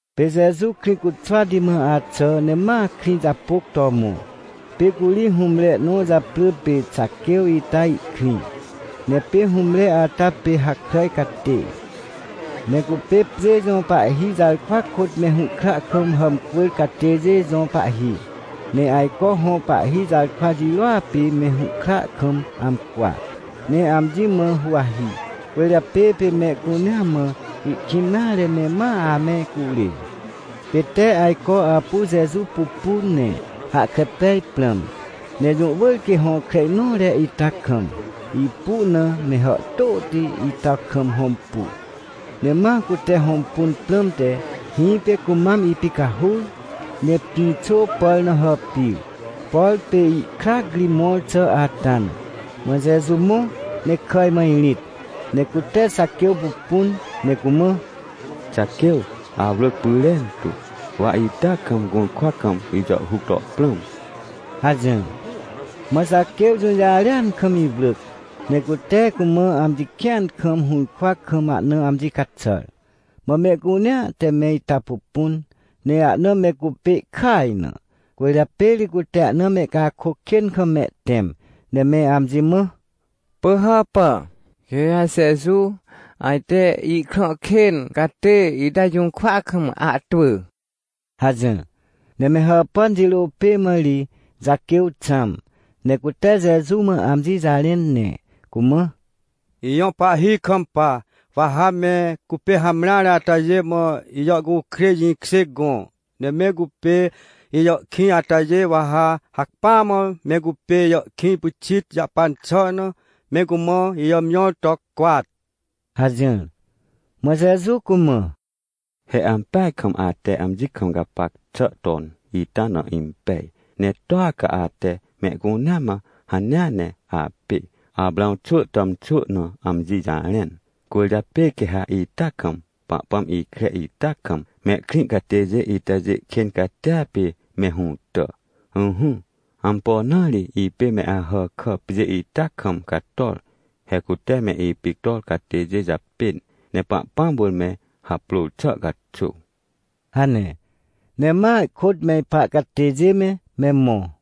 Pê Jeju Krĩcuxwati mã axà ne ma krĩ japôc to mõ. Pê curi hũmre nõ japrỳ pê Xaquêw ita ihkrĩ. Ne pê hũmre ata pê hakràj catê. Ne cupê pjê jõ pahhi jarkwa kôt me hũhkra kam hàmcwỳr catêjê jõ pahhi, ne ajco hõ pahhi jarkwa jirôa pê me hũhkra kam amcwa, ne amji mã huwahi. Cwỳrjapê pê mehcunea mã ihkĩn nare ne ma ame curê. Pê tee ajco apu Jeju pupun ne hahkre pej prãm, ne jũ wỳr quê hõkre nõre ita kam, ipu na me hàhtôti ita kam hõmpu. Ne ma cute hõmpun prãmte, hĩpê cumam ipicahur ne pĩxô pàr na hàpir, por pê ihkrac ri mõr xà ata na. Mã Jeju mõ ne kàj mã irĩt, ne cute Xaquêw pupun, ne cumã: ― Xaquêw, awrỳc pyrentu, wa ita kam gũrkwa kam ijàhhuc to prãm ― hajỹr. Mã Xaquêw jũjarêan kam iwrỳc, ne cute cumã amji kĩan kam hũrkwa kam ahna amji caxàr. Mã mehcunea te me ita pupun, ne ahna me cupê ihkaj na, cwỳrjapê ri cute ahna mehcakôc kên kam mehtẽm, ne me amji mã: ― Pỳhàpà, quê ha Jeju ajte ihkrã kên catê ita jũrkwa kam ahtwỳ ― hajỹr. Ne me hàpàn jirô pê mã ri Xaquêw xãm, ne cute Jeju mã amji jarẽn, ne cumã: ― Ijõ Pahhi, ikampa, wa ha me cupê hamreare atajê mã ijàhcukrêj jĩkjê gõ. Ne me cupê ijàhkĩj atajê, wa ha hacpỹa mã me cupê ijàhkĩj pyxit jahpan xà na, me cumã ijàmjõr to cwat ― hajỹr. Mã Jeju cumã: ― He ampeaj kam ate amji kam gapac xà ton ita na impej. Ne toa ca ate mehcunea mã hanea ne apê Aprãw xwỳ tàmxwỳ na amji jarẽn. Cwỳrjapê quê ha ita kam, Pahpãm ikre ita kam mehkrĩ catêjê itajê kên catia pê me hũtà. Ỹhỹ, ampo na ri ipê me Ahàkà pjê ita kam cator? He cute me ipictor catêjê japên, ne Pahpãm wỳr me haprôr xà caxuw ― hane, ne ma ihkôt me ipa catêjê me, me mõ.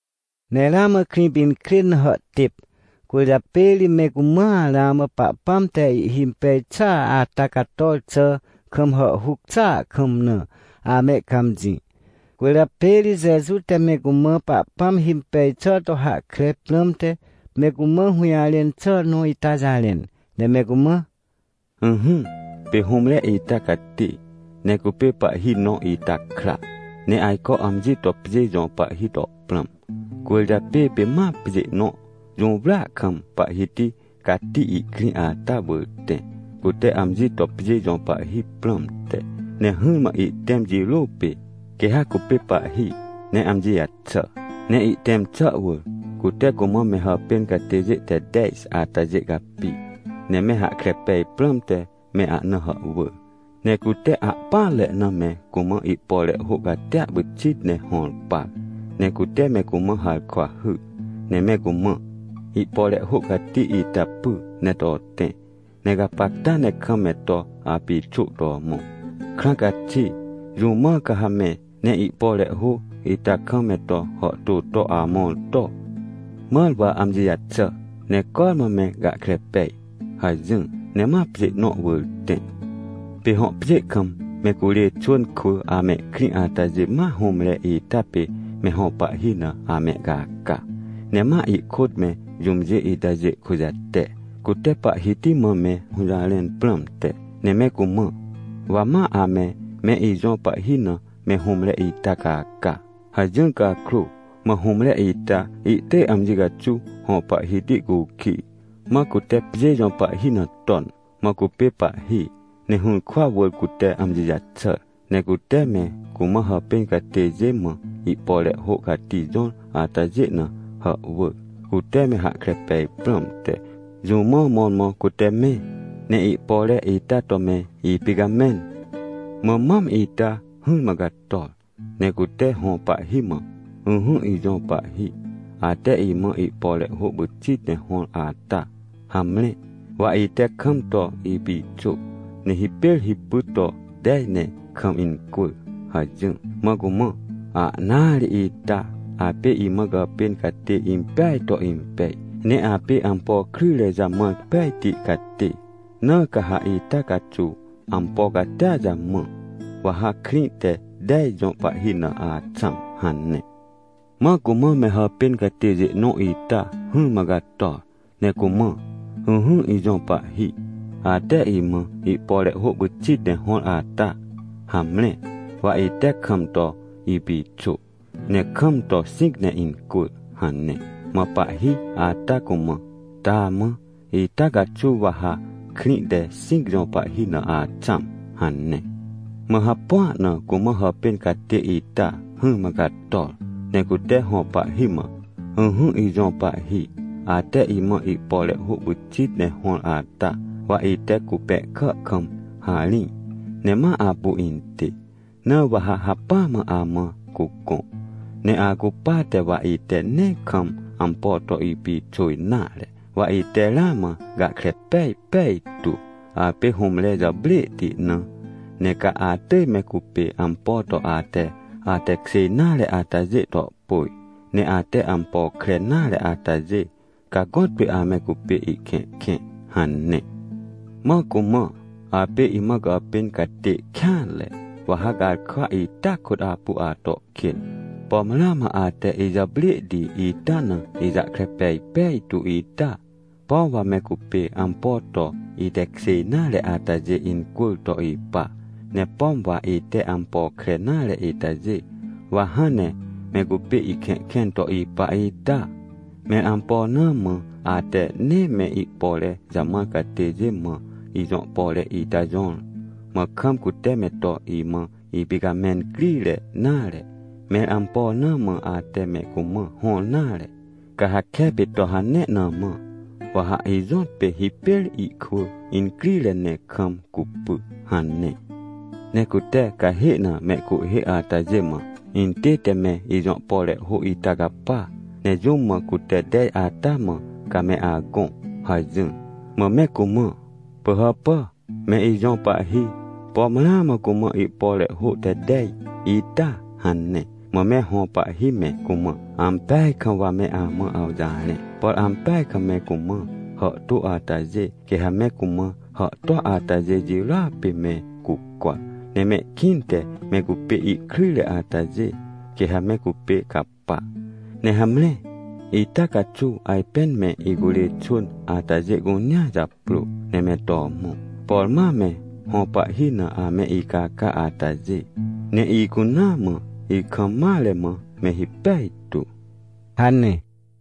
Ne ramã Krĩpinkrên na hàhtêp, cwỳrjapê ri me cumãa ramã Pahpãm te ihhimpej xà ata cator xà kam hàhhuc xàa kam na amehcãmjĩ. Cwỳrjapê ri Jeju te me cumã Pahpãm himpej xà to hahkre prãmte me cumã hũjarẽn xà nõ ita jarẽn, ne me cumã: ― Ỹhỹ, pê hũmre ita cati, ne cupê pahhi nõ ita kra. Ne ajco amji to pjê jõ pahhi to prãm, cwỳrjapê pê ma pjê nõ jũwrya kam pahhiti cati ihkrĩ ata wỳr tẽ, cute amji to pjê jõ pahhi prãmte. Ne hỹrmã ihtẽm jirô pê, quê ha cupê pahhi ne amji jaxà. Ne ihtẽm xà wỳr, cute cumã me hàpên catêjê te tej atajê capi, ne me hahkre pej prãmte me ahna hàhwỳr, ne cute ahpỹanre na me cumã ihpore hô catia pyxit ne hõr par. Ne cute me cumã harkwa hyr, ne me cumã: “Ihpore hô cati ita py ne to tẽ, ne gapacta ne kam me to apixô to mõ. Krãa caxi, jũ mã ca ha me, ne ihpore hô ita kam me to hàhtô to amõr to? Mãr wa amji jaxà, ne cormã me gahkre pej” hajỹr. Ne ma pjê nõ wỳr tẽ. ― Pê hõ pjê kam me curê xwỳn kwỳ amehkrĩ atajê ma hũmre ita pê me hõ pahhi na amehcaca. Ne ma ihkôt me jũmjê itajê kujate, cute pahhiti mã me hũjarẽn prãmte, ne me cumã: “Wa ma ame me ijõ pahhi na me hũmre ita caca” hajỹr cakrô, mã hũmre ita ihtỳj amji caxuw hõ pahhiti cukij, mã cute pjê jõ pahhi na ton. ― Mã cupê pahhi, ne hũrkwa wỳr cute amji jaxàr. Ne cute me cumã hàpên catêjê mã ihpore hô cati jõr atajê na hàhwỳr, cute me hahkre pej prãmte, jũ mã mõrmõ cute me, ne ihpore ita to me ipicamẽn. ― Mã mam ita hỹrmã cator, ne cute hõ pahhi mã: “Ỹhỹ, ijõ pahhi, ate imã ihpore hô pyxit ne hõr ata, hamre, wa ite kam to ipixô, ne hipêr hipy to tej ne kam incwỳr” hajỹr. ― Mã cumã: “Ahnaa ri ita! Apê imã gàpên catê impeaj to impej. Ne apê ampo kryjre jamãr pejti catê, na ca ha ita caxuw ampo catia jamã. Wa ha krĩ te tej jõ pahhi na axãm” hane. ― Mã cumã me hàpên catêjê nõ ita hỹrmã cator, ne cumã: “Ỹhỹ, ijõ pahhi, ate imã ihpore hô pyxit ne hõr ata, hamre, wa ite kam to ipixô, ne kam to xĩc ne incwỳr” hane. ― Mã pahhi ata cumã: “Taamã, ita caxuw wa ha krĩ te xĩc jõ pahhi na axãm” hane. ― Mã hapua na cumã hàpên catê ita hỹrmã cator, ne cute hõ pahhi mã: “Ỹhỹ, ijõ pahhi, ate imã ihpore hô pyxit ne hõr ata, wa ite cupẽhkà kam harĩj ne ma apu intê. Na wa ha hacpỹa mã amã cugõ. Ne acupate wa ite nee kam ampo to ipixô nare. Wa ite ramã gahkre pej pejtu, apê hũmre jàprêhti na. Ne ca atỳj me cupê ampo to ate atekjê nare atajê to pôj. Ne ate ampo kre nare atajê, ca gõtpê ame cupê ihkẽhkẽ” hane. ― Mã cumã: “Apê imã gàpên catê kêanre, wa ha garkwa ita kôt apu ato kên. Pom ramã ate ijàprêhti ita na ijahkre pej pejtu ita? Pom wa me cupê ampo to itekjê nare atajê incwỳr to ipa, ne pom wa ite ampo kre nare itajê, wa hãn ne me cupê ihkẽhkẽn to ipa ita? Mẽr ampo na mã ate nee me ihpore jamãr catêjê mã ijõ pore ita jõr, mã kam cute me to imã ipicamẽn crire nare? Mẽr ampo na mã ate me cumã hõr nare? Ca ha kepê to hane na mã, wa ha ijõtpê hipêr ihkwỳ incrire ne kam cupy” hane. ― Ne cute cahê na mehcuhhê atajê mã: “Intête me ijõ pore hô ita capa, ne jũm mã cute tej ata mã, ca me agõ” hajỹr. ― Mã me cumã: “Pỳhàpà, me ijõ pahhi, pom ramã cumã ihpore hô te tej ita” hane. ― Mã me hõ pahhi me cumã: “Ampeaj kam wa me amã awjarẽ, por ampeaj kam me cumã hàhtô atajê, quê ha me cumã hàhtô atajê jirôa pê me cucwa. Ne mehkĩnte me cupê ihkryjre atajê, quê ha me cupê capa. Ne hamre, ita caxuw, ajpên me icurê xwỳn atajê cunea japrô ne me to mõ, por ma me hõ pahhi na ame icaca atajê, ne icunaa mã, ikam mare mã me hipej tu!” ― hane.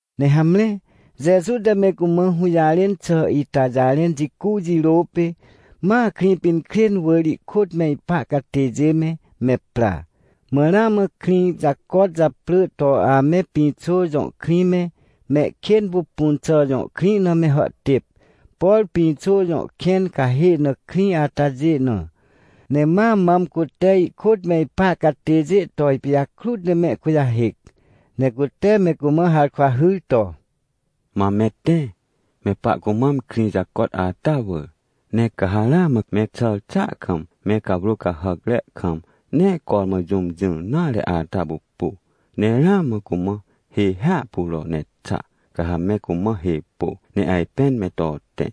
Ne hamre, Jeju te me cumã hũjarẽn xà ita jarẽn jicu jirô pê, ma Krĩpinkrên wỳr ihkôt me ipa catêjê me, me pra. Mã ramã krĩ jacot japrỳ to ame Pĩxô jõ krĩ me, Mehkênpupunxà jõ krĩ na me hàhtêp, por Pĩxô jõ kẽn cahê na krĩ atajê na. Ne ma mam cute ihkôt me ipa catêjê to ipijakrut ne mehkujahêc, ne cute me cumã harkwa hyr to: ― Mam me tẽ, me pahcumam krĩ jacot ata wỳr, ne ca ha ramã me axàr xàa kam, me cawrô cahàcre kam nee cormã jũm jỹr nare ata pupu, ne ramã cumã hê hiahpuro ne xa. Ca ha me cumã hê pô, ne ajpên me to tẽ.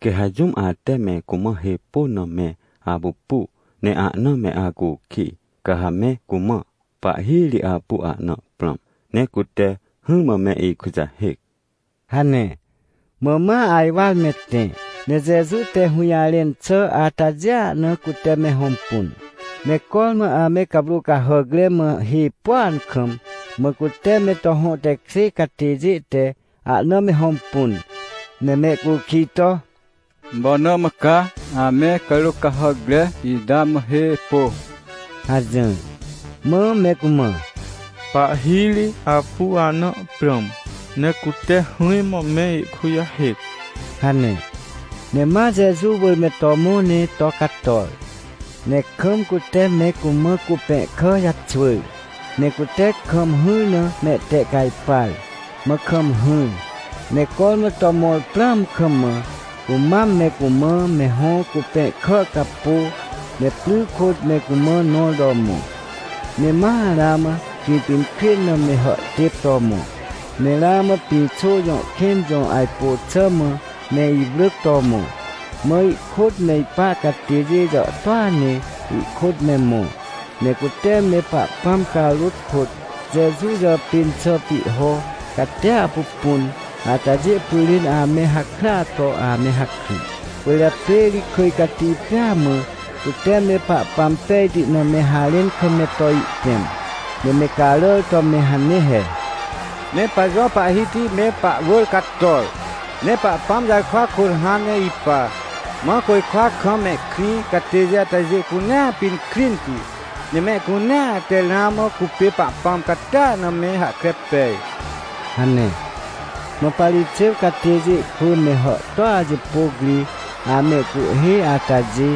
Quê ha jũm ate me cumã hê pôn na me apupu, ne ahna me acukij, ca ha me cumã: “Pahhi ri apu ahna prãm, ne cute hỹrmã me ikujahêc” ― hane. Mã ma ajwar me tẽ, ne Jeju te hũjarẽn xà atajêa na cute me hõmpun. Ne cormã ame cawrô cahàcre mã hê pôan kam, mã cute me to hõ tekjê catêjê te ahna me hõmpun, ne mehcukij to: ― Ampo na mã ca ame cawrô cahàcre ita mã hê pô? ― hajỹr. Mã me cumã: ― Pahhi ri apu ahna prãm, ne cute hỹrmã me ikujahêc ― hane. Ne ma Jeju wỳr me to mõ ne to cator. Ne kam cute me cumã cupẽhkà jaxwỳr, ne cute kam hỹr na mehtehcajpar, mã kam hỹr. Ne cormã to mõr prãam kam mã, cumam me cumã me hõ cupẽhkà capô, ne pry kôt me cumã nõr to mõ. Ne ma ramã Krĩpinkrên na me hàhtêp to mõ, ne ramã Pĩxô jõ kẽn jõ ajpô xà mã me iwrỳc to mõ. Mã ihkôt me ipa catêjê jàhtôa ne ihkôt me mõ. Ne cute me Pahpãm carôt kôt Jeju jàpên xà pihho catia pupun atajê pyrên ame hakrya to ame hakry. Cwỳrjapê ri kỳj cati pêa mã cute me Pahpãm pejti na me harẽn kam me to ihtẽm. Ne me caràr to me hane he: “Me pajõ Pahhiti me pahwỳr cator! Ne Pahpãm jarkwa kôt hãn ne ipa! Mã côjkwa kam mehkrĩ catêjê atajê cunea pinkrinti. Ne mehcunea te ramã cupê Pahpãm catia na me hahkre pej” hane. Mã Parixêw catêjê kwỳ me hàhtôa jipôc ri amehcuhhê atajê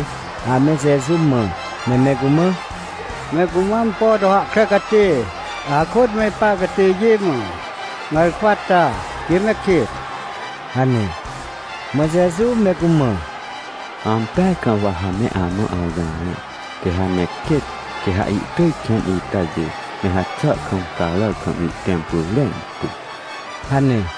ame Jeju mã, ne me cumã: ― Me cumã ampo to hahkre catê, akôt me ipa catêjê mã garkwa ta, quê me kêt ― hane. Mã Jeju me cumã: ― Ampeaj kam wa ha me amã awjarẽ, quê ha me kêt, quê ha ihtỳj kẽn itajê me haxà kam, caràr kam ihtẽm pyrentu ― hane.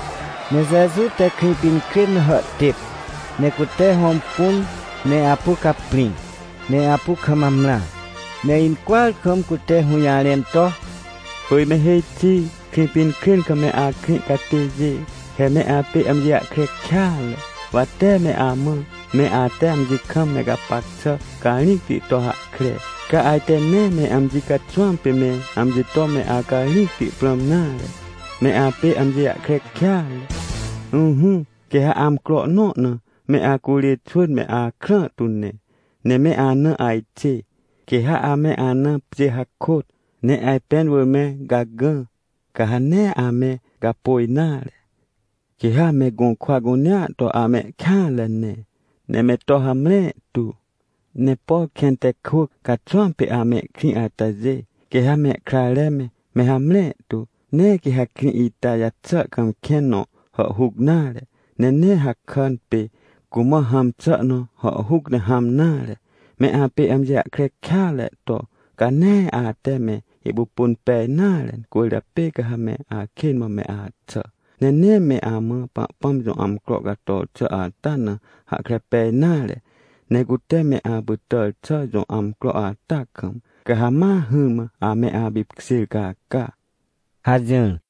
Ne Jeju te Krĩpinkrên na hàhtêp, ne cute hõmpun ne apu caprĩ, ne apu kam amrã. Ne incwỳar kam cute hũjarẽn to: ― Pỳj me hêj xi! Krĩpinkrên kam me akrĩ catêjê, he me apê amji jahkre kêatre. Wa tee me amã, me ate amji kam me gapac xà carĩcti to hahkre, ca ajte nee me amji caxwãm pê me amji to me acarĩcti prãm nare. Me apê amji jahkre kêatre! Ỹhỹ, quê ha amcro nõ na me acurê xwỳn me akrã tu ne, ne me ana ajxê. Quê ha ame ana pjê hakôt ne ajpẽn wỳr me gagã, ca ha nee ame gapôj nare. Quê ha me gũrkwa cunea to amehkêanre ne, ne me to hamre tu. Ne por kẽn te kwỳc caxwãm pê amehkrĩ atajê, quê ha mehkrare me, me hamre tu. Nee quê ha krĩ ita jaxà kam kẽn nõ hàhhuc nare. Ne nee hakàn pê cumã hãm xà nõ hàhhuc ne hãm nare. Me apê amji jahkre kêatre to, ca nee ate me ipupun pej nare, cwỳrjapê ca ha me akên mã me axà. Ne nee me amã Pahpãm jõ amcro cator xà ata na hahkre pej nare. Ne cute me apytàr xà jõ amcro ata kam, ca ha ma hỹrmã ame apipkjêr caca ― hajỹr.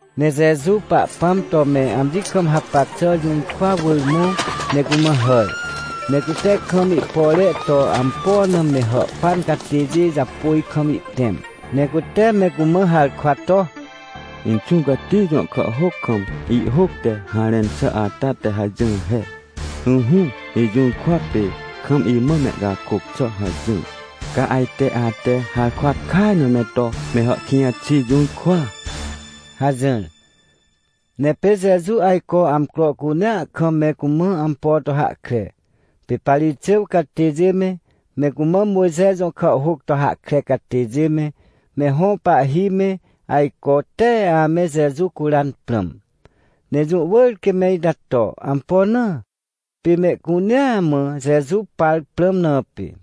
Ne Jeju Pahpãm to me amji kam hapac xà jũrkwa wỳr mõ ne cumã hàr, ne cute kam ihpore to ampo na me hàhpan catêjê japôj kam ihtẽm. Ne cute me cumã harkwa to: ― Inxũ Cati jõ kàhhôc kam, ihhôc te harẽn xà ata te hajỹr he: “Ỹhỹ, ijũrkwa pê kam imã mehcakôc xà” hajỹr. Ca ajte ate harkwa kaj na me to me hàhkĩj xi jũrkwa ― hajỹr. Ne pê Jeju ajco amcro cunea kam me cumã ampo to hahkre. Pê Parixêw catêjê me, me cumã Mojxe jõ kàhhôc to hahkre catêjê me, me hõ pahhi me, ajco tee ame Jeju curan prãm. Ne jũ wỳr quê me ita to. Ampo na? Pê mehcunea mã Jeju par prãm na pê.